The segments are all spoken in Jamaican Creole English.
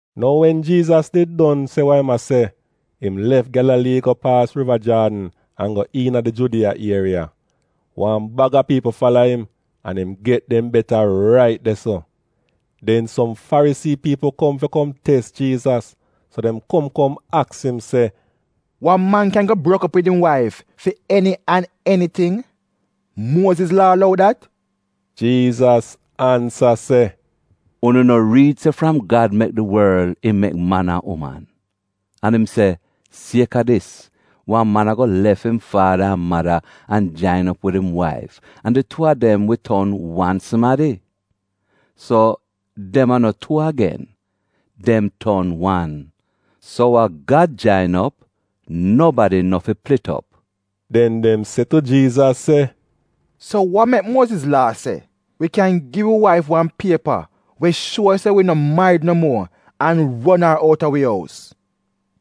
Nou wen Jiizas did don se we im a se, im lef Gyalalii go paas Riva Jaadn an go iina di Judiya ieriya. Wan baga piipl fala im, an im get dem beta rait de-so. Den, som Farisii piipl kom fi kom tes Jiizas. So dem kom kom aks im se, “Wan man kyan go brok op wid im waif fi eni an eniting? Muoziz Laa lou dat?” Jiizas ansa se, “Unu no riid se fram Gad mek di worl im mek man an uman, an im se, ‘Sieka dis, wan man ago lef im faada an mada an jain op wid im waif an di tuu a dem wi ton wan sumadi’? So dem a no tuu agen, dem ton wan. So wa Gad jain op, nobadi no fi plit op.” Den dem se tu Jiizas se, “So wa mek Muoziz Laa se, wi kyan gi wi waif wan piepa we shuo se wi no marid no muo, an ron ar out a wi ous?”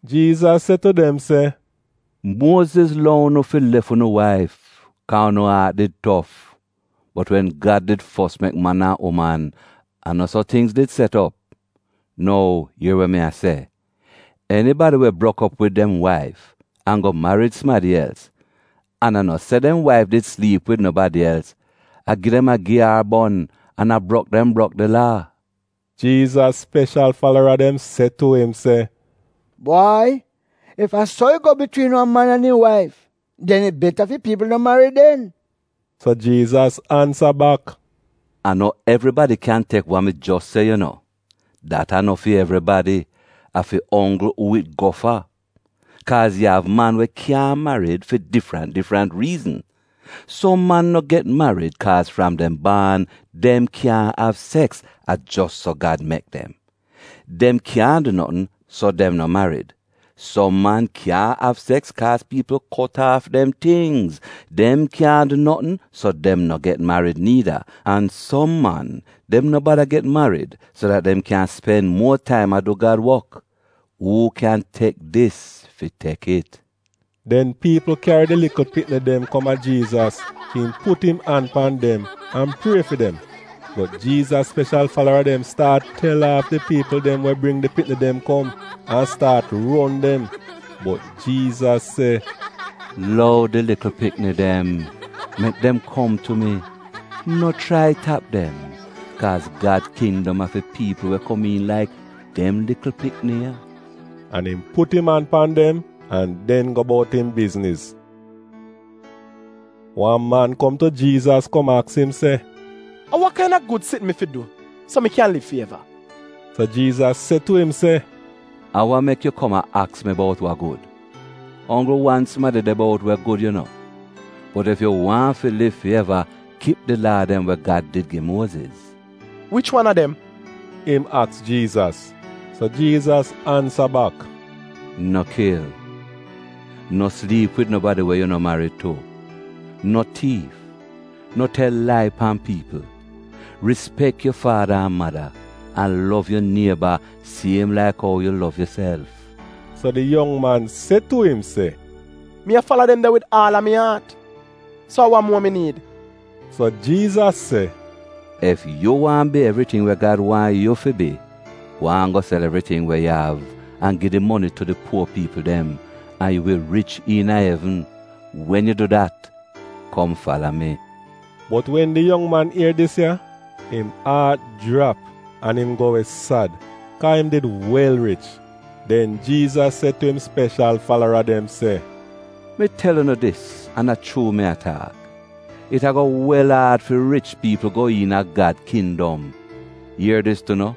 Jiizas se tu dem se, “Muoziz lou unu fi lef unu waif kaa unu aat did tof! Bot wen Gad did fos mek man an uman a no so tingz did set op. Nou ier we mi a se, enibadi we brok op wid dem waif an go marid sumadi els, an a no se dem waif did sliip wid nobadi els, a gi dem a gi ar bon an a brok dem brok di Laa!” Jiizas speshal falara dem se tu im se, “Bwai ef a so it go bitwiin wan man an im waif, den it beta fi piipl no marid den.” So Jiizas ansa bak, “A no evribadi kyan tek wa mi jos se yu no — dat a no fi evribadi; a fi onggl uu it go fa. Kaaz yu av man we kyaahn marid fi difrant difrant riizn. Som man no get marid kaaz fram dem baan dem kyaahn av seks — a jos so Gad mek dem. Dem kyaahn du notn so dem no marid. Som man kyaahn av seks kaaz piipl kot aaf dem tingz, dem kyaahn du notn so dem no get marid niida. An som man, dem no bada get marid so dat dem kyan spen muo taim a du Gad wok. Uu kyan tek dis fi tek it.” Den piipl kyari di likl pikni dem kom a Jiizas fi im put im an pan dem an prie fi dem. Bot Jiizas speshal falara dem staat tel aaf di piipl dem we bring di pikni dem kom, an staat ron dem. Bot Jiizas se, “Lou di likl pikni dem, mek dem kom tu mi. No chrai tap dem, kaaz Gad kindom a fi piipl we komiin laik dem likl pikni ya.” An im put im an pan dem, an den go bout im bizniz. Wan man kom tu Jiizas kom aks im se, “A wa kaina gud sitn mi fi du so mi kyan liv fi eva?” So Jiizas se tu im se, “A wa mek yu kom a aks mi bout wa gud? A onggl wan sumadi de bout we gud yu no. Bot ef yu waahn liv fi eva kip di Laa dem we Gad did gi Muoziz. “Wich wan a dem?” im aks Jiizas. So Jiizas ansa bak, “‘No kil, no sliip wid nobadi we yu no marid tu, no tiif, no tel lai pan piipl, rispek yu faada an mada’ an ‘Lov yu nieba siem laik ou yu lov yuself.’” So di yong man se tu im se, “Mi a fala dem de wid aal a mi aat. So a wa muo mi niid?” So Jiizas se, “Ef yu waahn bi evriting we Gad waahn yu fi bi, gwaan go sel evriting we yu av an gi di moni tu di puo piipl dem, an yu wi rich iina evn. Wen yu du dat, kom fala mi.” Bot wen di yong man ier dis ya, im aat jrap an im go we sad, kaa im did wel rich. Den Jiizas se tu im speshal falara dem se, “Mi tel unu dis an a chuu mi a taak, it ago wel aad fi rich piipl go iina Gad kindom! Ier dis tu no: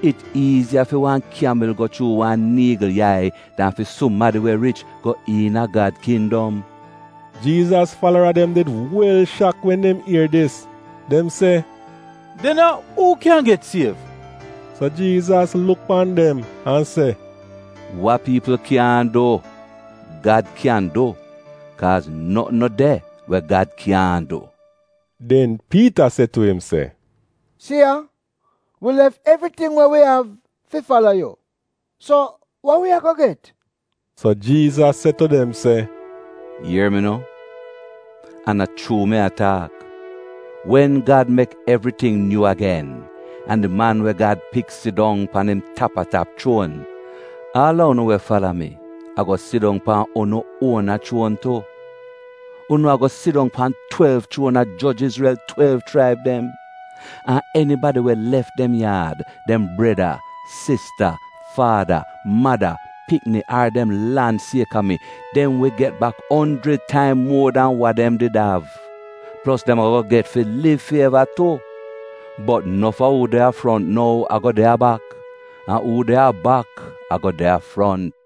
It iiziya fi wan kyamil go chuu wan niigl yai dan fi sumadi we rich go iina Gad kindom.” Jiizas falara dem did wel shak wen dem ier dis. Dem se, “Den a uu kyan get siev?” So Jiizas luk pan dem an se, “Wa piipl kyaahn du, Gad kyan du, kaaz notn no de we Gad kyaahn du.” Den Piita se tu im se, “Si ya! Wi lef evriting we wi av fi fala yu! So wa wi ago get?” So Jiizas se tu dem se, “Ier mi no, an a chuu mi a taak: Wen Gad mek evriting nyuu agen, an di Man we Gad Pik sidong pan im tap-a-tap chuon, aal a unu, we fala mi, ago sidong pan unu uona chuon tu. Unu ago sidong pan twelv chuon a joj Izrel twelv chraib dem. An enibadi we lef dem yaad, dem breda, sista, faada, mada, pikni ar dem lan sieka mi, dem wi get bak onjrid taim muo dan wa dem did av; plos dem ago get fi liv fi eva tu. Bot nof a uu de a front nou ago de a bak, an uu de a bak ago de a front.”